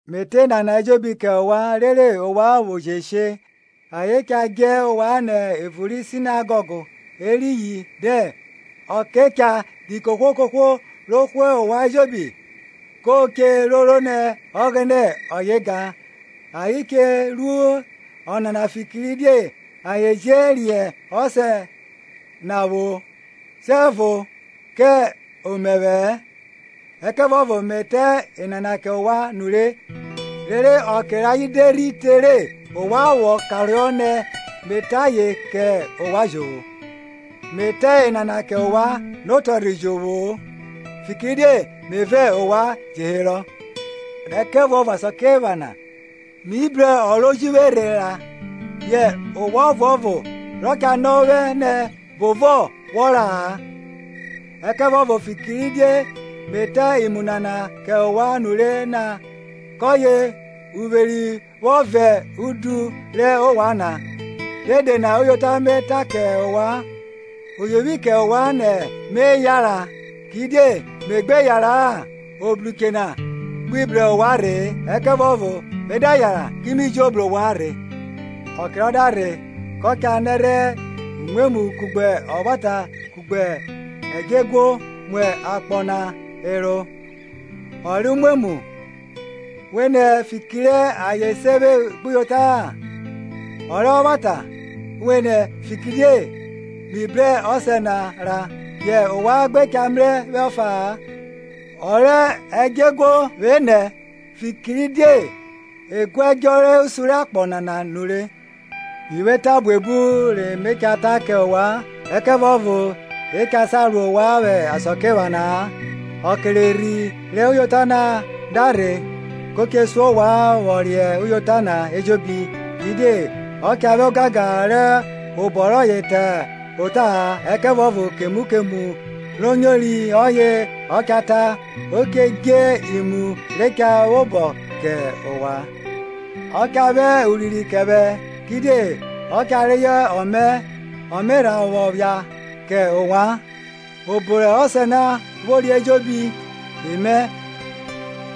Me ta enana ejobi kẹ ovwan rere ovwan vwo je she. Ayen cha djẹ ovwan nẹ evun ri sinegọg; eriyin dẹn, ọke cha ri kohwo kohwo ro hwe ovwan ejobi ko che roro nẹ Ọghẹnẹ ọye ga. Ayen che ru ọnana fikiridie ayen je riẹn Ọsẹ na vwo, siẹvo kẹ omẹvwẹ-ẹ. Ẹkẹvuọvo me ta enana kẹ ovwan nure, rere ọke rayen de rhi te re, ovwan vwọ karohọ nẹ me ta ayen kẹ ovwan jovwo. Iruo rẹ Erhi Ọfuanfon na Me ta enana kẹ ovwan notọrhe jovwo-o, fikiridie me vẹ ovwan je herọ. Ẹkẹvuọvo asakiephana mi bru ọ ro ji vwe rhe ra; yẹ ovwan ọvuọvo rọ cha nọ vwẹ nẹ, Bovọ wọ ra-a? Ẹkẹvuọvo fikiridie me ta imu nana kẹ ovwan nure na, kọye uvweri vwọ vọn udu rẹ ovwan na. Dede na uyota na me ta kẹ ovwan: oyovwi kẹ ovwan nẹ me yanran, kidie me gbe yanran, Obruche na gbi bru ovwan rhe-e; ẹkẹvuọvo me da yanran, ki mi jo bru ovwan rhe. Ọke rọ da rhe, kọ cha nẹrhẹ umwemwu kugbe ọvwata kugbe ẹdjọeguo mu akpọ na ẹro. Ọ rẹ umwemwu vwenẹ, fikiridie ayen se vwe gbuyota-a; ọ rẹ ọvwata vwenẹ, fikiridie mi bru Ọsẹ na ra, yẹ ovwan gbe cha mrẹ vwẹ ọfa-a; ọ rẹ ẹdjọeguo vwenẹ, fikiridie e guẹdjọ rẹ osun rẹ akpọ nana nure. Mi vwo eta buebu re me cha ta kẹ ovwan, ẹkẹvuọvo e cha sa ro ovwan vwẹ asakiephana-a. Ọke rẹ Erhi rẹ uyota na da rhe, ko che sun ovwan vwọ riẹn uyota na ejobi; kidie ọ cha vwẹ ogangan rẹ obọ rọye ta ota-a, ẹkẹvuọvo kemu kemu ro nyori ọye ọ cha ta, o che dje imu re cha vwobọ kẹ ovwan. Ọ cha vwẹ urinrin kẹ vwẹ, kidie ọ cha reyọ ọmẹ ọ me rha vwọ phia kẹ ovwan. Obo rẹ Ọsẹ na vwori ejobi emẹ;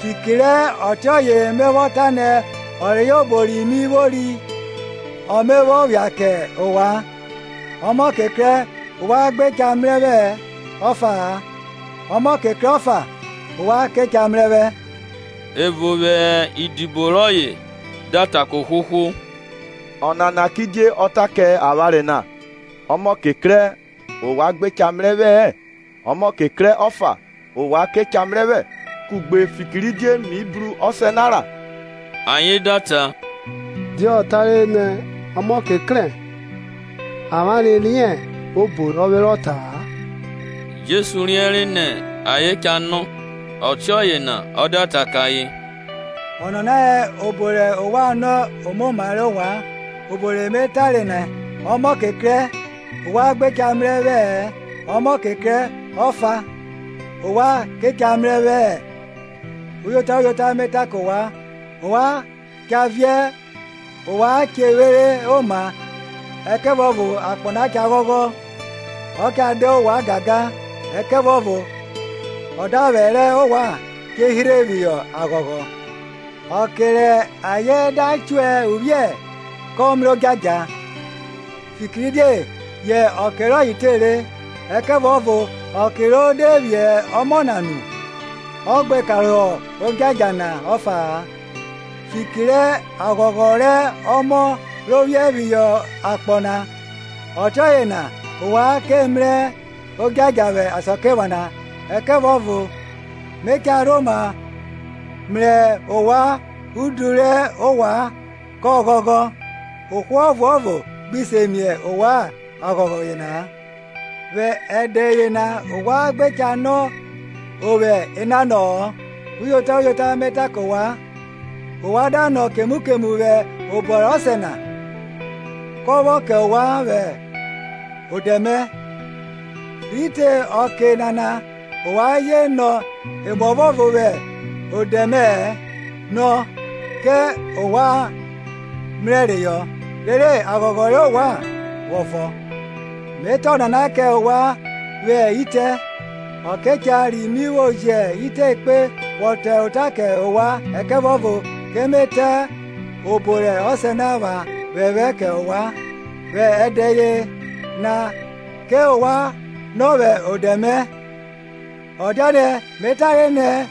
fiki rẹ ọtiọye me vwọ ta nẹ ọ reyọ obo ri mi vwori ọ me vwọ phia kẹ ovwan. Ọmọke krẹ, ovwan gbe cha mrẹ vwẹ ọfa-a; ọmọke krẹ ọfa, ovwan ke cha mrẹ vwẹ. Evo vwẹ idibo rọye da ta kẹ ohwohwo, Ọnana kidie ọ ta kẹ avwanre na, Ọmọke krẹ, ovwan gbe cha mrẹ vwẹ-ẹ, ọmọke krẹ ọfa, ovwan ke cha mrẹ vwẹ; kugbe, fikiridie mi bru Ọsẹ na ra? Ayen da ta, Die ọ tare na, ọmọke krẹ? Avwanre riẹn obo rọ vwe rọ ta-a. Jesu riẹnre nẹ ayen cha nọ; ọtiọye na ọ da ta kẹ ayen, Ọnana hẹ obo rẹ ovwan nọ omoma rẹ ovwan, obo re me tare nẹ, Ọmọke krẹ, ovwan gbe cha mrẹ vwẹ-ẹ, ọmọke krẹ ọfa, ovwan ke cha mrẹ vwẹ? Uyota, uyota, me ta kẹ ovwan, ovwan cha viẹ ovwan che vwere oma, ẹkẹvuọvo akpọ na cha ghọghọ; ọ cha da ovwan gangan, ẹkẹvuọvo ọdavwẹ rẹ ovwan che hirhe phihọ aghọghọ. Ọke rẹ aye da chuẹ uvwiẹ kọ mrẹ odjadja, fikiridie yẹ ọke rọye tere; ẹkẹvuọvo ọke ro de vwiẹ ọmọ na nu, ọ gbe karohọ odjadja na ọfa-a, fiki rẹ aghọghọ rẹ ọmọ ro vwiẹ phihọ akpọ na. Ọtiọye na ovwan ke mrẹ odjadja vwẹ asakiephana, ẹkẹvuọvo me cha rhoma mrẹ ovwan udu rẹ ovwan kọ ghọghọ, ohwo ọvnovo gbi se mie ovwan aghọghọ yena-a. Vwẹ ẹdẹ yena ovwan gbe cha nọ vwẹ enanọ-ọ. Uyota, uyota, me ta kẹ ovwan, ovwan da nọ kemu kemu vwẹ obọ rẹ Ọsẹ na, kọ vwọ kẹ ovwan vwẹ odẹ mẹ. Rhi te ọke nana ovwan je nọ emuọvo vwẹ odẹ mẹ-ẹ; nọ, kẹ ovwan mrẹ reyọ, rere aghọghọ rẹ ovwan vwọ vọn. Me ta onana kẹ ovwan vwẹ itẹ; ọke cha ri mi vwo jẹ itẹ ekpe vwọ ta ota kẹ ovwan, ẹkẹvuọvo ke me ta obo rẹ Ọsẹ na epha phephẹ kẹ ovwan. Vwẹ ẹdẹ yena ovwan ke nọ vwẹ odẹ mẹ; ọ dianẹ me tare nẹ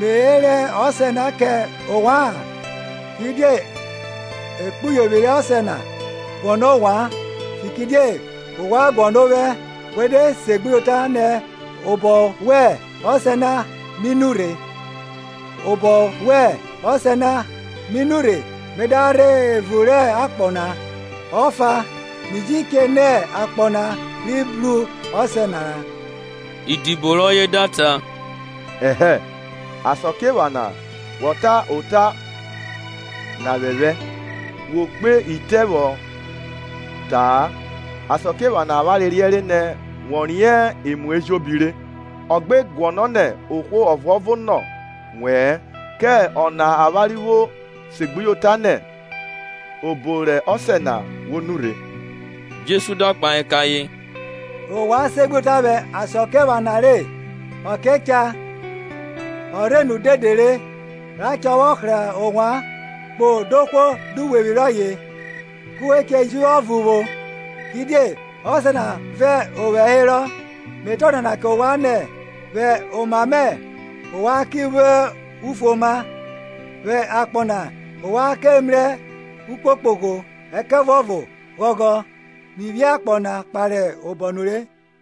me rẹ Ọsẹ na kẹ ovwa-an; kidie ekpuyovwi rẹ Ọsẹ na guọnọ, ovwan, fikiridie ovwan guọnọ ovwẹ we de segbuyota nẹ obọ rẹ Ọsẹ na mi nurhe. Obọ rẹ Ọsẹ na mi nurhe me da rhe evun rẹ akpọ na; ọfa, mi ji che nẹ akpọ na rhivwi bru Ọsẹ na ra. Idibo rọye da ta, Ẹhẹ, asakiephana wọ ke ta ota na phephẹ, wo kpe itẹ vwọ ta-a! Asakiephana avwanre riẹnre nẹ wọ riẹn emu ejobi re, ọ gbe guọnọ nẹ ohwo ọvuọvo nọ wẹ-ẹ; kẹ ọna avwanre vwo segbuyota nẹ obọ rẹ Ọsẹ na wọ nurhe. Jesu da kpahe kẹ ayen, Ovwan segbuyota vwẹ asakiephana re? Ọke cha, o rhe nu dede re, ra cha vwọ hra ovwan, kpo dohwo duwevwi rọye, ku we che ji vwe ọvo vwo, kidie Ọsẹ na vẹ ovwẹ herọ. Me ta ọnana kẹ ovwan nẹ, vwẹ oma mẹ ovwan ki vwo ufuoma. Vwẹ akpọ na ovwan mrẹ ukpokpogho; ẹkẹvuọvo ghọghọ, mi phi akpọ na kpare obọ nure.